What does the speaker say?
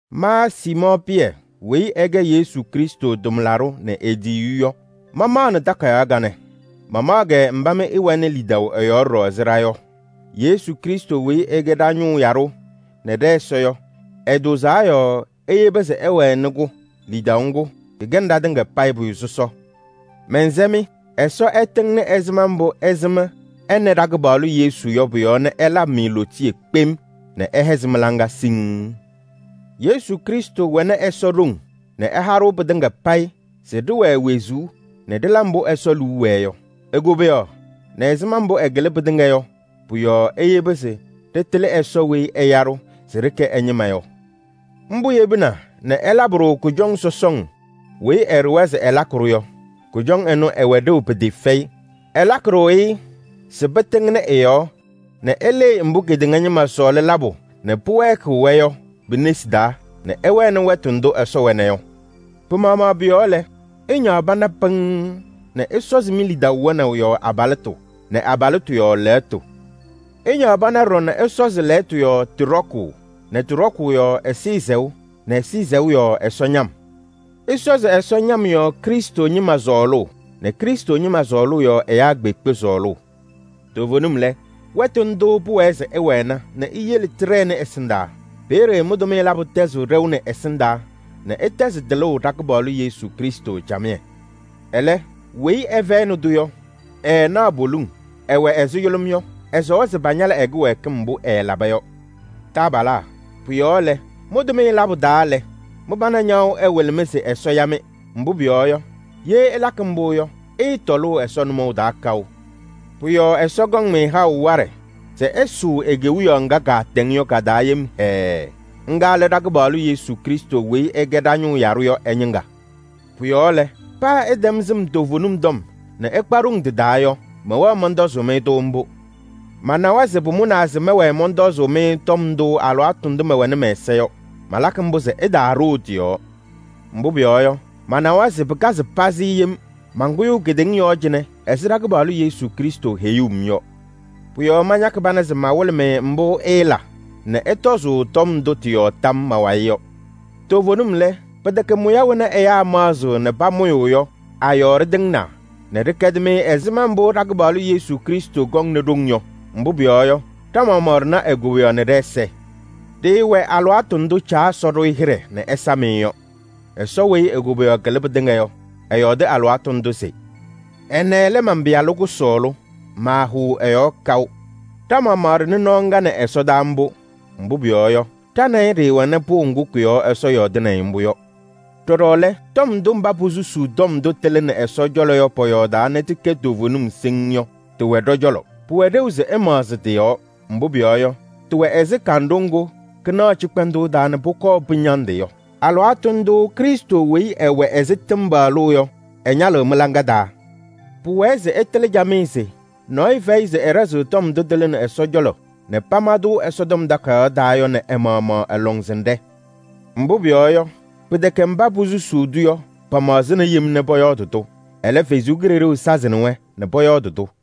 Ma Siimɔɔ Pɩyɛ weyi ɛkɛ Yesu Krɩstʋ tʋmlaɖʋ nɛ e-tiyiyu yɔ, mamaɣnɩ takayaɣ kanɛ. Mamaɣ-kɛ mba mɩ ɩwɛnɩ lidaʋ ɛ-yɔɔ ɖɔɖɔ ɛzɩ ɖa yɔ. Yesu Krɩstʋ weyi ɛkɛ ɖa-ñʋʋ yaɖʋ nɛ ɖɛ-Ɛsɔ yɔ, ɛtʋʋzaa yɔɔ eyebi se ɩwɛnɩ-kʋ. Lidaʋ ŋgʋ, kɩkɛnɩ ɖatɩŋa payɩ pʋyʋ sɔsɔ. Mɛnsɛ-mɩ: Ɛsɔ ɛtɩŋnɩ ɛzɩma mbʋ ɩsɩm ɛ nɛ ɖa-kɩpaɣlʋ Yesu yɔ pʋ-yɔɔ nɛ ɛlabɩ-mɩ lootiye kpem nɛ ɛhɛzɩ mɩ-laŋa siŋŋ. Yesu Krɩstʋ wɛnɩ Ɛsɔ ɖoŋ nɛ ɛha-ɖʋ pɩtɩŋa payɩ se ɖɩwɛɛ wezuu nɛ ɖɩla mbʋ Ɛsɔ liu wɛɛ yɔ. E-koboyaɣ nɛ ɛzɩma mbʋ ɛkɩlɩ pɩtɩŋa yɔ, pɔ-yɔɔ eyebi se ɖɩtɩlɩ Ɛsɔ weyi ɛya-ɖʋ se ɖɩkɛ ɛ-ñɩma yɔ. Mbʋ yebina nɛ ɛlabɩ-ɖʋ kʋjɔŋ sɔsɔŋ weyi ɛɖʋwa se ɛlakɩ-ɖʋ yɔ, ɩwɛ ɖeu pɩtɩɩfɛyɩ. Ɛlakɩ-ɖʋ-ɩ se pɩtɩŋnɩ ɩ-yɔɔ nɛ ɩlɩɩ mbʋ kedeŋa ñɩma sɔɔlɩ labʋ nɛ pɩwɛɛkɩɣ-wɛ yɔ pi-nesi taa nɛ ɩwɛnɩ wɛtʋ ndʋ Ɛsɔ wɛna yɔ. Pɩ-maɣmaɣ pʋ-yɔɔ lɛ, ɩñaɣ pana pɩŋŋ nɛ ɩsɔzɩ mi-lidaʋ wɛnaʋ yɔɔ abalɩtʋ nɛ abalɩtʋ yɔɔ lɛɣtʋ. Ɩñaɣ pana ɖɔɖɔ nɛ ɩsɔzɩ lɛɣtʋ yɔɔ tɩ ɖɔkʋʋ nɛ tɩ ɖɔkʋʋ yɔɔ ɛzɩyɛ sɛʋ nɛ ɛzɩyɛ sɛʋ yɔɔ Ɛsɔ ñam. Ɩsɔzɩ Ɛsɔ ñam yɔɔ Krɩstʋ ñɩma sɔɔlʋʋ nɛ Krɩstʋ ñɩma sɔɔlʋʋ yɔɔ ɛyaa kpeekpe sɔɔlʋʋ. Toovenim lɛ, wɛtʋ ndʋʋ pʋwɛɛ se ɩwɛna nɛ iyele tɩɖɛnɩ ɛsɩndaa. Peeye mɩ-tʋmɩyɛ labʋ tɛzɩɣ ɖɛʋ nɛ ɛsɩndaa nɛ ɩtɛzɩ tɩlʋʋ ɖa-Kɩpaɣlʋ Yesu Krɩstʋ camɩyɛ. Ɛlɛ, weyi ɛfɛyɩnɩ-tʋ yɔ, ɛɛnaɣ poliŋ, ɛwɛ ɛzɩ yʋlʋm yɔ. Ɛsɔwa se pañalɩ ɛ-kɩwɛɛkɩm mbʋ ɛɛlaba yɔ. Taabalaa, pʋ-yɔɔ lɛ, mɩ-tʋmɩyɛ labʋ taa lɛ, mɩ-pana ñaɣʋ ɛwɩlɩ-mɩ se Ɛsɔ ya-mɩ. Mbʋ pʋyɔɔ yɔ, ye ɩlakɩ mbʋ yɔ, ɩɩtɔlʋʋ Ɛsɔ nʋmɔʋ taa kaʋ. Pʋ-yɔɔ Ɛsɔ kɔŋ-mɩ haʋ waɖɛ se ɩsʋʋ e-Kewiyaɣ ŋga kaatɛŋ yɔ ka-taa yem hɛɛɛ. Ŋga lɛ ɖa-Kɩpaɣlʋ Yesu Krɩstʋ weyi ɛkɛ ɖa-ñʋʋ yaɖʋ yɔ ɛ-ñɩŋga. Pʋ-yɔɔ lɛ, paa ɩtɛm sɩm toovenim tɔm nɛ ɩkpa ɖoŋ tɩ-taa yɔ, mɛwɛɣ mɔntɔzʋʋ-mɩ-tʋ mbʋ. Manawa se pʋmʋnaa se mɛwɛɛ mɔntɔzʋʋ-mɩ tɔm ndʋ alɩwaatʋ ndʋ mɛwɛnɩ mɛ-ɛza yɔ. Malakɩ mbʋ se ɩtaaɖoo tɩ-yɔɔ. Mbʋ pʋyɔɔ yɔ, manawa se pɩkazɩ pazɩ yem mankʋyʋʋ kedeŋa yɔɔ cɩnɛ ɛzɩ ɖa-Kɩpaɣlʋ Yesu Krɩstʋ heyuu-m yɔ. Pʋ-yɔɔ mañakɩ pana se mawɩlɩ-mɩ mbʋ ɩɩla nɛ ɩtɔzʋʋ tɔm ndʋ tɩ-yɔɔ tam ma-wayɩ yɔ. Toovenim lɛ, pɩtɛkɛ mʋya wena ɛyaa maɣzɩɣ nɛ pamʋyʋʋ yɔ a-yɔɔ ɖɩtɩŋnaa nɛ ɖɩkɛdɩ-mɩ ɛzɩma mbʋ ɖa-Kɩpaɣlʋ Yesu Krɩstʋ kɔŋ nɛ ɖoŋ yɔ. Mbʋ pʋyɔɔ yɔ, ɖa-maɣmaɣ ɖɩna e-koboyaɣ nɛ ɖɛ-ɛza. Ɖɩɩwɛ alɩwaatʋ ndʋ Caa Ɛsɔ ɖʋ-ɩ hɩɖɛ nɛ ɛsam-ɩ yɔ. Ɛsɔ weyi e-koboyaɣ kɩlɩ pɩtɩŋa yɔ, ɛyɔɔdɩ alɩwaatʋ ndʋ se: “Ɛnɛ lɛ man-Pɩyalʋ kʋsɔɔlʋ, maahʋʋ ɛ-yɔɔ kaʋ.” Ɖa-maɣmaɣ ɖɩnɩ nɔɔ ŋga nɛ ɛsɔdaa mbʋ. Mbʋ pʋyɔɔ yɔ, ɖa nɛ ɩ ɖɩɩwɛnɩ pʋʋ ŋgʋ kʋ-yɔɔ Ɛsɔ yɔɔdɩnɩ-ɩ mbʋ yɔ. Ɖɔɖɔ lɛ, tɔm ndʋ mba posusuu tɔm ndʋ tɩlɩnɩ Ɛsɔ cɔlɔ yɔ pɔyɔɔdaa nɛ tɩkɛ toovenim siŋŋ yɔ, tɩwɛ ɖɔ-cɔlɔ. Pʋwɛ ɖeu se ɩmaɣzɩ tɩ-yɔɔ. Mbʋ pʋyɔɔ yɔ, tɩwɛ ɛzɩ kanɖʋ ŋgʋ kɩnaɣ cɩkpɛndʋʋ taa nɛ pʋkɔɔ pɩñandɩ yɔ. Alɩwaatʋ ndʋʋ Krɩstʋ weyi ɛwɛ ɛzɩ tɩmbalʋʋ yɔ, ɛñalɩɣ mɩ-hɔ taa. Pʋwɛɛ se ɩtɩlɩ camɩyɛ se: nɔɔyʋ fɛyɩ se ɛɖɛzɩɣ tɔm ndʋ tɩlɩnɩ Ɛsɔ cɔlɔ nɛ pama-tʋ Ɛsɔtɔm Takayaɣ taa yɔ nɛ ɛ-maɣmaɣ ɛ-lɔŋsɩnɖɛ. Mbʋ pʋyɔɔ yɔ, pɩtɛkɛ mba posusuu-tʋ yɔ pamaɣzɩna yem nɛ pɔyɔɔdɩ-tʋ. Ɛlɛ, Ɛsɔ Kalɩzaɣ sazɩnɩ-wɛ nɛ pɔyɔɔdɩ-tʋ.